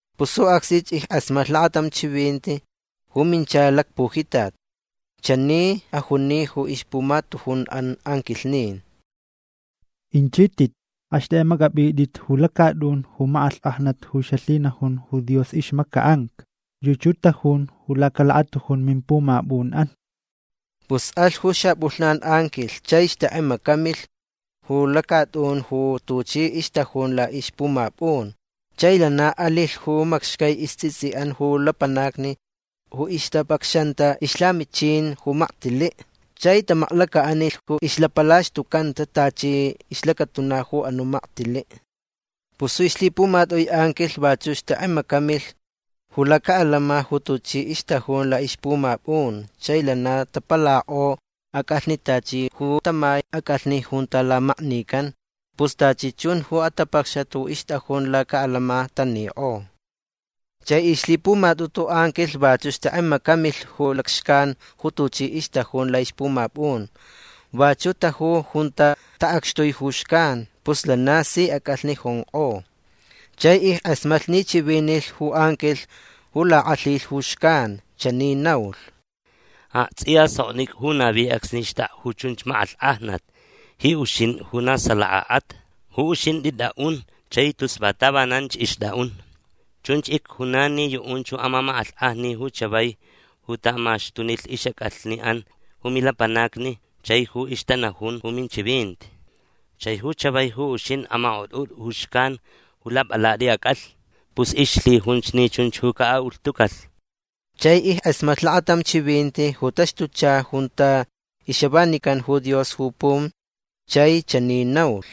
Pus ju acsnich ickʼasmatlh lakatam chivinti ju minchalh lacpujitat. Chani ajuni ju ixpumatujunʼan anquilhnin: ―Inchitʼit. Axtʼekʼemacʼapʼitʼit ju lacatʼun ju makʼalhkʼajnat ju xalhinajun ju Dios ixmacaʼanca. Yuchi ju tajun lacalakatujun mimpumapʼunʼan. Pus alh ju xapʼulhnan anquilh chai xtʼekʼemacamilh ju lacatʼun ju tuchi ixtajun laʼixpumapʼun. Chai lana alilh ju macxcai istsʼitsʼiʼan ju lapanacni ju ixtapacxanta ixlhamichin ju maktiliʼ chai tamaklacaʼanilh ju ixlapalaxtucanta tachi ixlacatuna ju anuʼ maktiliʼ. Pus ju ixlhipumatʼui anquilh vachuʼ xtʼekʼemacamilh ju lacaʼalama ju tuchi ixtajun laʼixpumapʼun. Chai lana tapalakʼo acʼalhni tachi ju tamai acʼalhni junta lamaknican. Pus tachi chun ju atapacxat ju ixtʼajun lacaʼalama tanikʼo. Chai ixlhipumatʼutu anquilh vachuʼ xtʼekʼemacamilh ju lacxcan ju tuchi ixtajun laʼixpumapʼun. Vachuʼ taju junta taʼacxtui ju xcan. Pus lana si acʼalhni jonkʼo. Chai ickʼasmatlh ni chivinilh ju anquilh ju lakʼalhilh ju xcan. Chani naulh: ―Aktsʼiya soknicʼa ju navi acsni xtʼakʼa ju chunch makʼalhkʼajnat ji uxintʼi ju na salakaʼat. Ju uxintʼi tʼaʼun chai tus va tavananch ixtʼaʼun. Chunch icjunan ni yuʼunch ju amamakʼalhkʼajni ju chavai ju taʼamaxtunilh ixʼacʼalhniʼan ju milapanacni chai ju ixtanajun ju minchivinti. Chai ju chavai ju uxintʼi amakʼotʼutʼa ju xcan ju lapʼalatʼi acʼalhni. Pus ixlhijunch ni chunch ju caʼaʼulhtucalh. Chai ickʼasmatlh lakatam chivinti ju taxtuchalh junta ixavanican ju Dios ju pum. Chai chani naulh: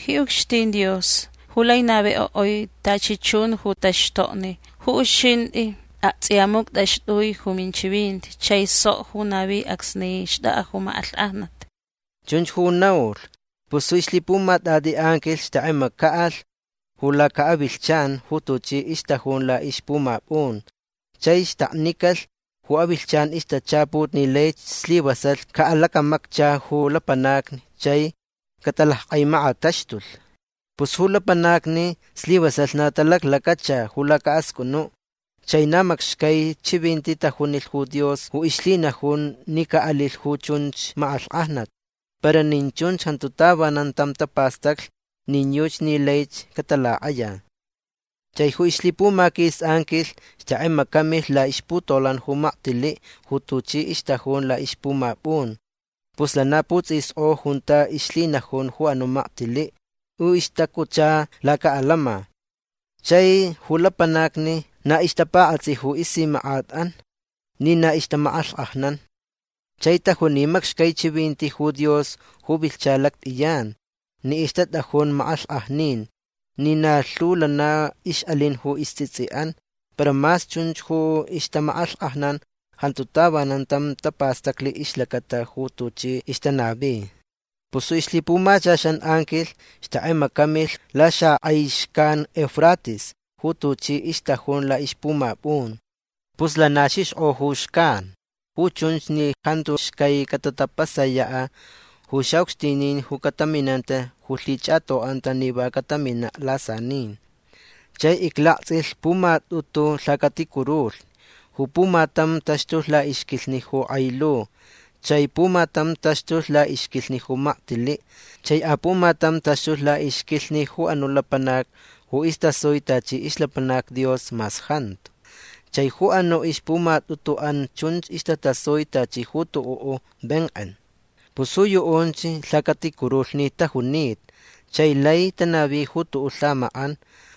―Ji ucxtin Dios ju lai navikʼoʼui tachi chun ju taxtokni ju uxintʼi aktsʼiya muctʼaxtʼui ju minchivinti chai sok ju navi acsni xtʼakʼa ju makʼalhkʼajnat. ―Chunch ju naulh. Pus ju ixlhipumatʼatʼi anquilh xtʼekʼemacaʼalh ju lacaʼavilhchan ju tuchi ixtajun laʼixpumapʼun. Chai xtaknicalh ju avilhchan ixtachaput ni laich slivasalh caʼalacamaccha ju lapanacni chai catalackʼaimakataxtulh. Pus ju lapanacni slivasalh na talaclacacha ju lacaʼascʼunuʼ. Chai na macxcai chivinti tajunilh ju Dios ju ixlhinajun ni caʼalilh ju chunch makʼalhkʼajnat. Para nin chunch jantu tavanan tam tapastaclh nin yuchi ni laich catalakʼaya. Chai ju ixlhipumaquis anquilh xtʼekʼemacamilh laʼixputolan ju maktiliʼ ju tuchi ixtajun laʼixpumapʼun. Pus lana putsʼiskʼo junta ixlhinajun ju anuʼ maktiliʼ ju ixtacutcha lacaʼalama. Chai ju lapanacni na ixtapakʼatsʼi ju isimakʼatʼan ni na ixtamakʼalhkʼajnan. Chai tajuni macxcai chivinti ju Dios ju vilhcha lactʼiyan ni ixtatʼajun makʼalhkʼajnin ni na lhu lana ixʼalin ju istsʼitsʼiʼan. Para mas chunch ju ixtamakʼalhkʼajnan jantu tavanan tam tapastaclh ixlacata ju tuchi ixtanavi. Pus ju ixlhipumachaxan anquilh xtʼekʼemacamilh laxakʼai xcan Eufrates ju tuchi ixtajun laʼixpumapʼun. Pus lana xixkʼo ju xcan. Ju chunch ni jantu xcai catatapasayaʼ ju xaʼucxtinin ju cataminanta ju lhichʼatoʼanta ni va cataminaʼ lasanin. Chai iclaktsʼilh pumatʼutu lhacaticurulhni. Ju pumatam taxtulh laʼixquilhni ju kʼai lu. Chai pumatam taxtulh laʼixquilhni ju maktiliʼ. Chai apumatam taxtulh laʼixquilhni ju anuʼ lapanac ju istasui tachi ixlapanac Dios mas jantu. Chai ju anuʼ ixpumatʼutuʼan chunch istasui tachi ju tuʼuʼ venkʼen. Pus ju yuʼunch lhacaticurulhni tajunita. Chai lai tanavi ju tuʼuʼ lhamakʼan.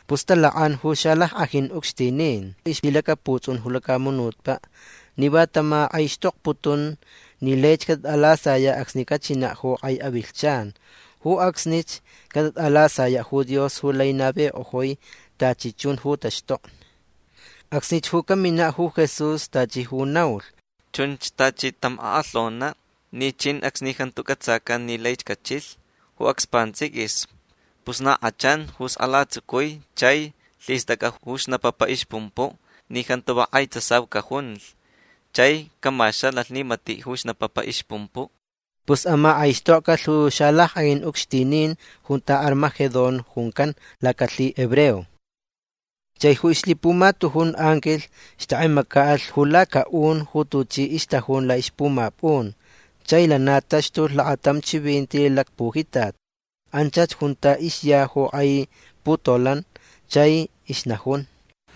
Pus talakʼan ju xalackʼajin ucxtinin ixlhilacaputsʼun ju lacamunutpaʼ ni va tamakʼaixtokputun ni laich catalasayaʼ acsni cachinaʼ ju kʼai avilhchan. Ju acsnich catatʼalasayaʼ ju Dios ju lai navikʼojui tachi chun ju taxtokni. Acsnich ju caminaʼ ju Jesús tachi ju naulh. Chunch tachi tam akʼalhonaʼ ni chin acsni jantu cʼatsacan ni laich cachilh ju acs pantsʼiquis. Pus na kʼachanch ju skʼala tsucui chai lhistʼacʼa ju snapapa ixpumpuʼ ni jantu va kʼai tsasau cajunlh chai camaxanalh ni matiʼ ju xnapapa ju ixpumpuʼ. Pus amakʼaixtokcalh ju xalackʼajin ucxtinin junta Armagedón juncan lacalhihebreo. Chai ju ixlhipumatujun anquilh xtʼekʼemacaʼalh ju lacaʼun ju tuchi ixtajun laʼixpumapʼun. Chai lana taxtulh lakatam chivinti lacpujitat. Anchach junta ixya ju kʼai putolan. Chai ixnajun: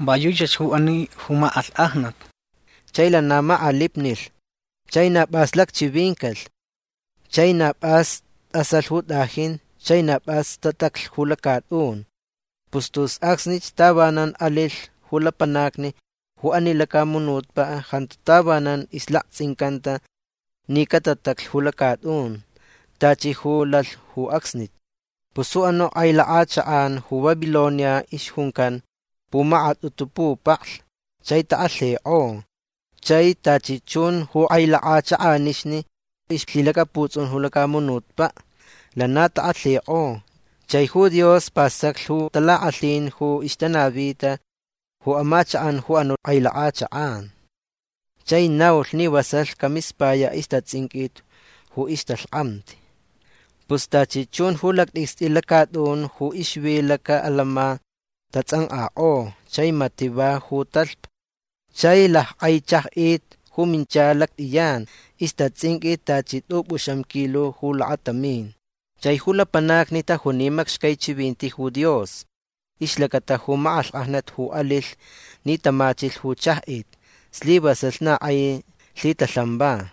―Va yuchach ju ani ju makʼalhkʼajnat. Chai lana makʼalipnilh. Chai na pʼas lacchivincalh. Chai na pʼas tʼasalh ju tʼajin. Chai na pʼas tataclh ju lacatʼun. Pus tus acsni tavanan alilh ju lapanacni ju ani lacamunutpaʼ jantu tavanan ixlaktsʼincanta ni catataclh ju lacatʼun tachi ju lalh ju acsni. Pus ju anuʼ kʼai lakʼachakʼan ju Babilonia ixjuncan pumakatʼutu pupaklh chai takʼalhikʼo. Chai tachi chun ju kʼai lakʼachakʼanixni ixlhilacaputsʼun ju lacamunutpaʼ lana takʼalhikʼo. Chai ju Dios pastaclh ju talakʼalhin ju ixtanavita ju amachakʼan ju anuʼ kʼai lakʼachakʼan. Chai naulh ni vasalh camispayaʼ ixtatsʼinqʼuit ju ixtalhkʼamti. Pus tachi chun ju lactʼicstʼi lacatʼun ju ixvi lacaʼalama tatsʼankʼakʼo. Chai matiʼ va ju talhpa. Chai lackʼai chajʼit ju minchalh lactʼiyan. Ixtatsʼinqʼui tachi tʼupʼuxam kilo ju lakatamin. Chai ju lapanacni tajuni macxcai chivinti ju Dios ixlacata ju makʼalhkʼajnat ju alilh ni tamachilh ju chajʼit. Slivasalh na kʼai lhitalhan va.